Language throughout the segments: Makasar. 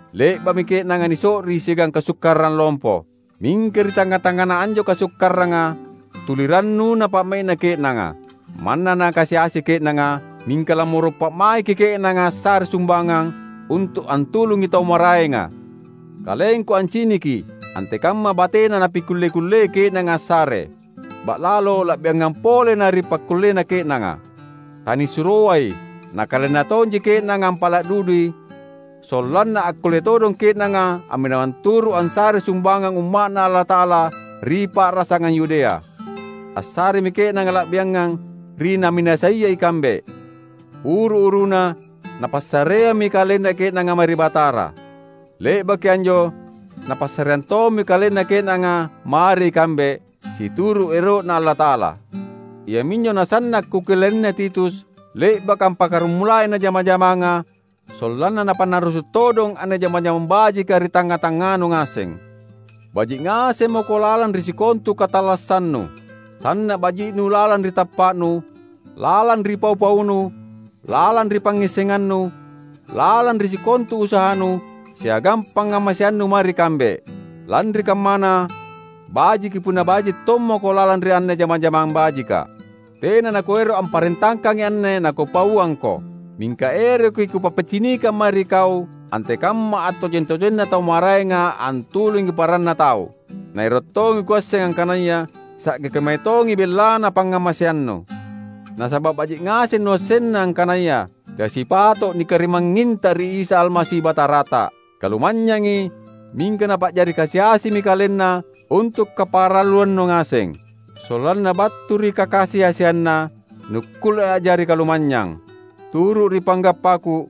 Le’ba’mi ke’nanga niso’ri siagang kasukkarang lompo. Mingka ri tangnga-tangngana anjo kasukkaranga, tuli rannuna pa’mai’na ke’nanga. Manna nakasi-asi ke’nanga, mingka lammoro’ pa’maiki ke’nanga assare sumbangang, untu’ antulungi tau maraenga. Kalengku anciniki antekamma batena napikulle-kullei ke’nanga assare, ba’lalo la’biangampa pole na ri pakkullena ke’nanga. Tanisuroai, nakalenna tonji ke’nanga ampala’ dudui sollanna akkulle todong ke’nanga amminawang turu’ ansarei sumbangang Umma’Na Allata’ala ri pa’rasangang Yudea. Assaremi ke’nanga la’biangang ri naminasaia ikambe. Uru-uruna napassareammi kalenna ke’nanga mae ri Batara. Le’baki anjo napassareang tommi kalenna ke’nanga mae ri kambe, situru’ ero’Na Allata’ala. Iaminjo nasanna’ kukellaina Titus — le’baka ampakaramulai anne jama-jamanga — sollanna napannarrusu’ todong anne jama-jamang bajika ri tangnga-tangnganu ngaseng. Baji’ ngaseng mako lalang ri sikontu katallassannu. Sanna’ baji’nu lalang ri tappa’nu, lalang ri pau-paunu, lalang ri pangngissengannu, lalang ri sikontu usahanu, siagang pangngamaseannu mae ri kambe. Lanri kammana bajiki punna baji tommako lalang ri anne jama-jamang bajika. Tena nakuero’ amparentakangi anne nakupauangko. Mingka eroki kupappicinikang mae ri kau antekamma attojeng-tojenna tau maraenga antulungi paranna tau. Na ero’ tongi kuasseng angkanaya sa’ge kemae tongi bellana pangngamaseannu. Nasaba’ baji’ ngaseng nuassenna angkanaya teai sipato’ nikarimangnginta ri Isa Almasi Batarata: Kalumanynyangi, mingka Napa’jari kasi-asimi KalenNa untu’ kaparalluannu ngaseng; sollanna battu ri kakasi-asianNa nukkulle a’jari kalumanynyang. Turu’ ri panggappaku,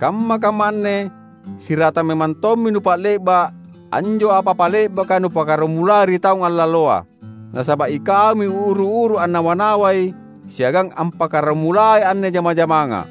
kamma-kamma anne siratang memang tommi nupa’le’ba’ anjo apa-apa le’baka nupakaramulai ri taung allaloa. Nasaba’ ikaumi uru-uru annawa-nawai siagang ampakaramulai anne jama-jamanga.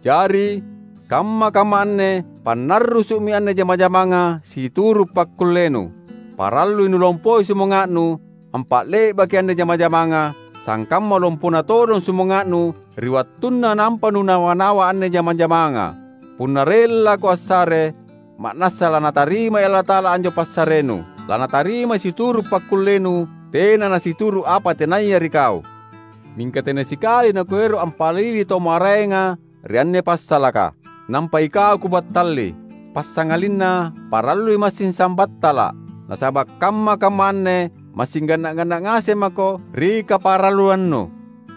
Jari, kamma-kamma anne pannarrusu’mi anne jama-jamanga situru’ pakkullenu. Parallui nulompoi sumanga’nu ampa’le’baki anne jama-jamanga, sangkamma lompona todong sumanga’nu ri wattunna nampa nunawa-nawa anne jama-jamanga. Punna rellako assare, ma’nassa laNatarimai Allata’ala anjo passarenu. Lanatarimai situru’ pakkullenu, tena nasituru’ apa tenaya ri kau. Mingka tena sikali nakuero’ ampalili tau maraenga ri anne passalaka, nampa ikau kubattalli. Passangalinna parallui massing sambattala’. Nasaba’ kamma-kamma anne massing ganna’-ganna’ ngaseng mako ri kaparalluannu;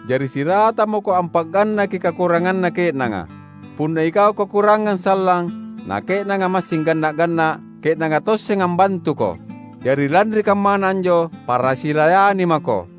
jari siratang mako ampa’gannaki kakuranganna ke’nanga. Punna ikau kakurangang sallang, na ke’nanga massing ganna’-ganna’, ke’nanga tosseng ambantuko. Jari lanri kammana anjo, para silayani mako.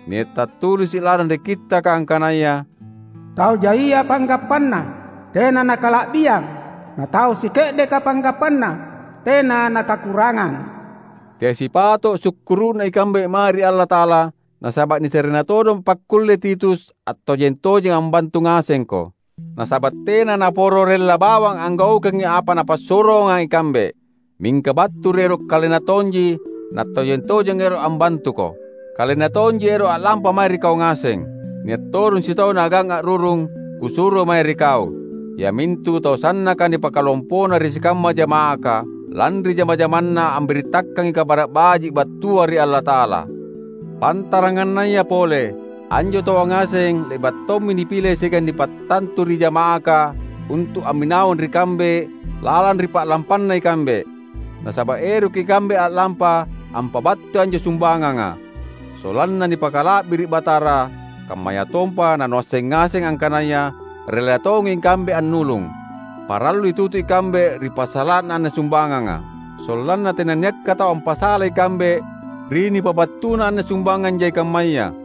Nia’ tattulisi’ lalang ri Kittaka angkanaya, "Tau jaia panggappana, tena nakala’biang, na tau sike’deka panggappana, tena nakakurangang." Teai sipato’ sukkuru’na ikambe mae ri Allata’ala nasaba’ nisarena todong pakkulle Titus attojeng-tojeng ambantu ngasengko! Nasaba’ tena naporo rella bawang anggaukangi apa napassuroanga ikambe. Mingka battu ri ero’ kalenna tonji nattojeng-tojeng ero’ ambantuko. Kalenna tonji ero’ a’lampa mae ri kau ngaseng. Nia’ todong sitau naagang a’rurung kusuro mae ri kau. Iamintu tau sannaka nipakalompona ri sikamma jama’aka, lanri jama-jamanna ambirittakangi Kabara’ Baji’ battua ri Allata’ala. Pantarangannaya pole, anjo taua ngaseng le’ba’ tommi nipile siagang nipattantu ri jama’aka untu’ amminawang ri kambe lalang ri pa’lampanna ikambe. Nasaba’ eroki ikambe a’lampa ampabattui anjo sumbanganga; sollanna nipakala’biri’ Batara, kammayatompa nanuasseng ngaseng angkanaya rella tongi ikambe annulung. Parallui tutu ikambe ri passala’na anne sumbanganga. Sollanna tenanniakka tau ampasalai ikambe ri nipabattuna anne sumbangang jai kammaya.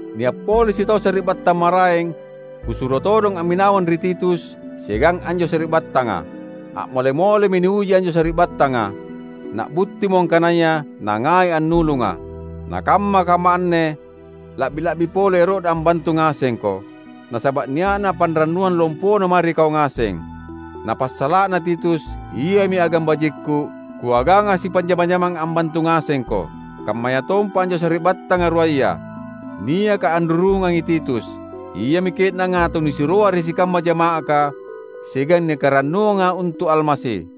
Nia’ pole sitau sari’battang maraeng kusuro todong amminawang ri Titus siagang anjo sari’battanga. A’mole-molemi niuji anjo sari’battanga, na’buttimo angkanaya nangai annulunga. Na kamma-kamma anne, la’bi-la’bi pole ero’na ambantu ngasengko, nasaba’ nia’na panrannuang lompona mae ri kau ngaseng. Na passala’na Titus, iami agang bajikku, kuaganga sipanjama-jamang ambantu ngasengko. Kammayatompa anjo sari’battanga ruaya, niaka anrurungangi Titus, iami ke’nanga tau nisuroa ri sikamma jama’aka, siagang nikarannuanga untu’ Almasi.